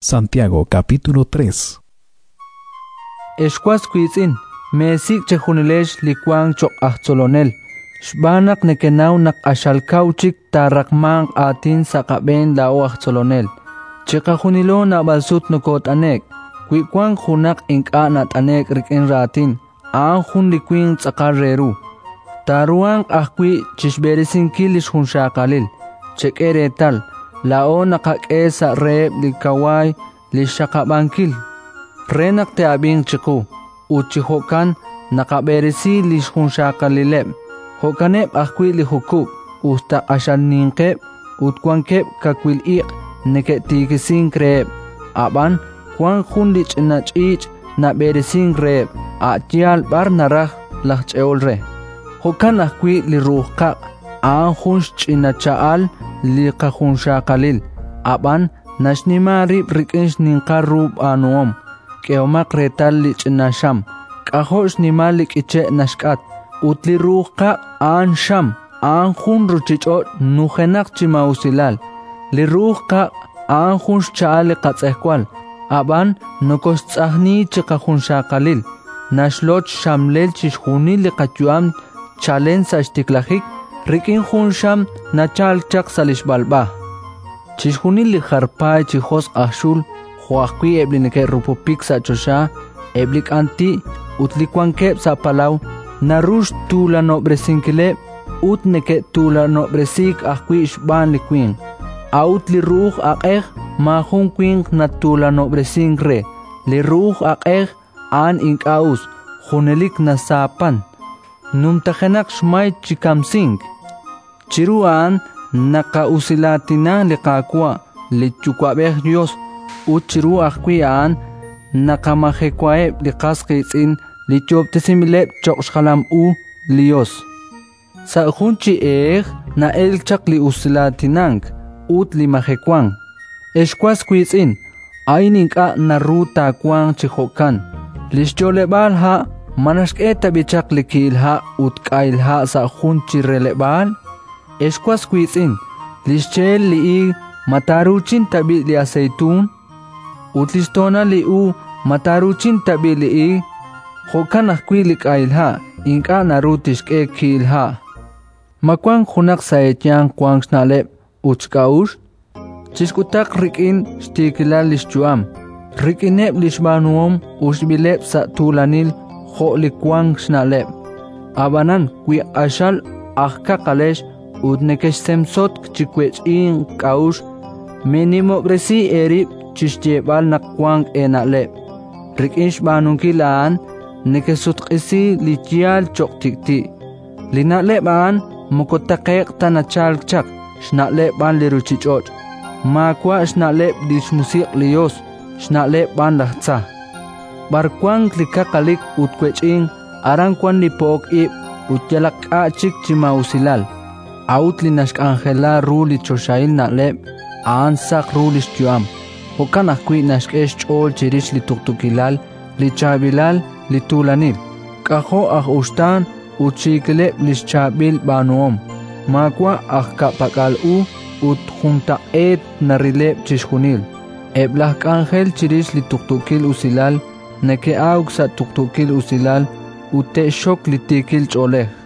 Li ru'uj qaq' Ex was wiitz'in, meesik' chejunilex li wank cho'q aj tzolonel, xb'aan naq nekenaw naq q'axal kaw chik taaraqmanq aatin sa' qab'een laa'o aj tzolonel. Chiqajunilo naab'al sut nokoot'ane'k. Wi wank junaq ink'a' nat'ane'k rik'in raatin, a'an jun li winq tz'aqal re ru; taaruhanq ajwi' chi xb'eresinkil li xjunxaqalil. Chek'e reetal, laa'o naqak'e sa' reheb' li kawaay li xxaqab'ankil, re naq te'ab'inq chiqu, ut chi jo'kan naqab'eresi li xjunxaqalileb'. Jo'kaneb' ajwi' li jukub': us ta q'axal ninqeb' ut wanqeb' kawil iq' neke'tiikisink reheb', ab'an wank jun li ch'ina ch'iich' nab'eresink reheb', a' yaal b'ar naraj laj ch'e'ol re. Jo'kan ajwi' li ru'uj qaq': a'an jun xch'ina cha'al li qajunxaqalil, ab'an naxnima rib' rik'in xninqal ru b'aanuhom. K'ehomaq reetal li ch'ina xam: k'ajo' xnimal li k'iche' naxk'at! Ut li ru'uj qaq' a'an xam, a'an jun ruuchich'och' nujenaq chi maa'usilal. Li ru'uj qaq' a'an jun xcha'al li qatz'ejwal, ab'an nokooxtz'ajni chi qajunxaqalil; naxloch xxamlel chixjunil li qayu'am chalen sa' xtiklajik, rik'in jun xam nachalk chaq sa' li xb'alb'a. Chixjunil li jar paay chi josq' aj xul, jo' ajwi' eb' li neke'rupupik sa' choxa, eb' li k'anti' ut li wankeb' sa' palaw, naru xtuulanob'resinkileb', ut neke'tuulanob'resiik ajwi' xb'aan li winq. A'ut li ru'uj aq'ej maajun winq natuulanob'resink re; li ru'uj aq'ej a'an ink'a' us, junelik nasaapan, numtajenaq xmay chi kamsink. Chiru a'an naqa'usilaatina li Qaawa', li Yuwa'b'ej Yos, ut chiru ajwi' a'an naqamajewaheb' li qas qiitz'in li yoob'tesinb'ileb' cho'q xjalam u li Yos. Sa' jun chi ehej na'elk chaq li usilaatinank ut li majewank. Ex was wiitz'in, a'in ink'a' naru taawanq chi jo'kan. Li xyo'leb'aal ha' ma naxk'e tab'i' chaq li ki'il ha' ut k'ahil ha' sa' jun chi releb'aal? Ex was wiitz'in, li xche'el li iig ma taaruuchin tab'i' li aseytuun? Ut li xtoonal li uub' ma taaruuchin tab'i' li iig? Jo'kan ajwi' li k'ahil ha' ink'a' naru tixk'e ki'il ha'. Ma wank junaq sa' eeyanq wank xna'leb' ut xk'a'uxl? Chixk'utaq rik'in xtiikilal li xyu'am, rik'ineb' li xb'aanuhom uxb'ileb' sa' tuulanil jo' li wank xna'leb'. Ab'anan wi q'axal aj kaqalex ut nekexsemsotk chi wech'ink k'a'uxl, meenimob'resi eerib' chi xyeeb'al naq wank eena'leb'. Rik'in xb'aanunkil a'an nekesutq'isi li yaal cho'q tik'ti'. Li na'leb' a'an moko taqe'q ta nachalk chaq, xna'leb' b'an li ruuchich'och'; maawa' xna'leb' li xMusiq' li Yos, xna'leb' b'an laj tza. B'ar nawank li kaqalik ut wech'ink, aran wank li po'ok ib' ut yalaq k'a' chik chi maa'usilal. A'ut li naxk'anjela ru li choxahil na'leb', a'an saq ru li xyu'am; jo'kan ajwi' naxk'e xch'ool chirix li tuqtuukilal, li chaab'ilal, li tuulanil. K'ajo' aj uxtaan ut xiikileb' li xchaab'il b'aanuhom! Maawa' aj ka'pak'al u ut juntaq'eet narileb' chixjunil. Eb' laj k'anjel chirix li tuqtuukil usilal neke'awk sa' tuqtuukil usilal ut te'xxok li tiikil ch'oolej.